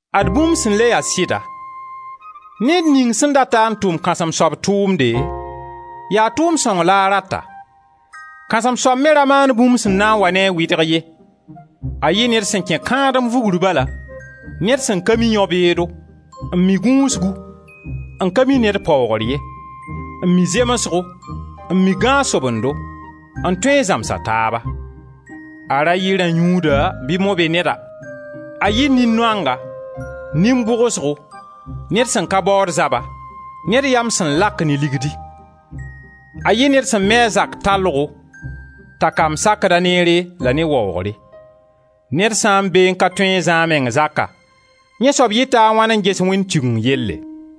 Ad bũmb sẽn le ya sɩda: ned ning sẽn dat-a n tʋm kãsem-soab tʋʋmde, yaa tʋʋmd sõng la a rata. Kãsem-soab me ra maan bũmb sẽn na n wa ne a wɩdg ye; a yɩ ned sẽn kẽ kãadem vugr bala, ned sẽn ka mi yão-beedo, n mi gũusgu, n ka mi ned paoogr ye, n mi zemsgo, n mi gãag-sobendo, n tõe n zãms a taaba. A ra yɩ rã-yũuda bɩ mo-be-neda, a yɩ nin-noanga, nin-bʋgsgo, ned sẽn ka baood zaba, ned yam sẽn lak ne ligdi. A yɩ ned sẽn mi a zak tallgo, t'a kamb sakd-a neere la ne waoogre. Ned sã n beẽ n ka tõe n zã a meng zaka, yẽ soab yɩta a wãn n ges Wẽnd Tigeng yelle?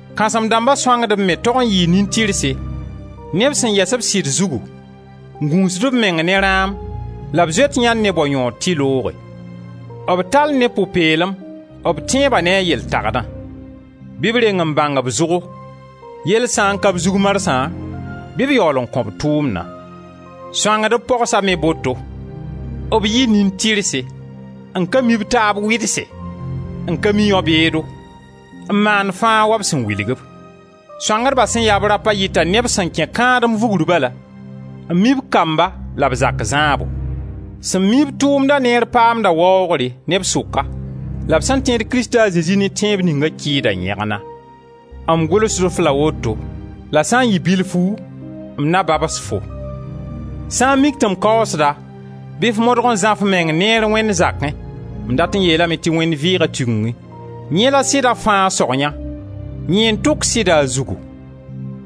Kãsem-dãmba sõangdb me tog n yɩɩ nin-tɩrse, neb sẽn yɛs b sɩd zugu, n gũusd b meng ne rãam, la b zoet yãnd ne bao yõod tɩ looge. B tall ne pʋ-peelem b tẽebã ne a yel tagdã. Bɩ b reng n bãng b zʋgo; yell sã n ka b zug marsã bɩ b yaool n kõ-b tʋʋmna. Sõangdb pogsa me boto: b yɩ nin-tɩrse, n ka mi b taab wɩdse, n ka mi yão-beedo, n maand fãa wa b sẽn wilg-b. Sõangdba sẽn ya-b rapa yɩta neb sẽn kẽ kãadem vugr bala, n mi b kamba la b zak zãabo. Sẽn mi-b tʋʋmda neere paamda waoogre neb sʋka la b sẽn tẽed Krista a Zezi ne tẽeb ninga kɩɩda yẽgna. M gʋlsd-f la woto la sã n yɩ bilfu m na babs-fo. Sã n mik tɩ m kaoosda, bɩ f modg n zã f meng neer Wẽnd zakẽ — m dat n yeelame tɩ Wẽnd vɩɩga Tigengẽ — yẽ la sɩda fãa sog yã, yẽ n tʋk sɩda a zugu.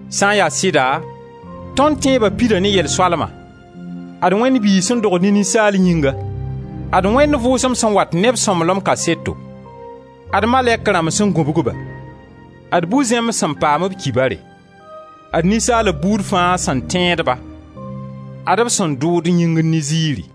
Sã n ya sɩda, tõnd tẽeba pida ne yel-soalma: ad Wẽnd Biig sẽn dogd ne ninsaal yĩnga; ad Wẽnd Vʋʋsem sẽn wat ne b sõmblem kaseto; ad malɛk rãmb sẽn gũbg-ba, ad bu-zẽmb sẽn paam b kibare; ad ninsaalb buud fãa sẽn tẽed-ba; ad-b sẽn dʋʋd yĩngr ne ziiri.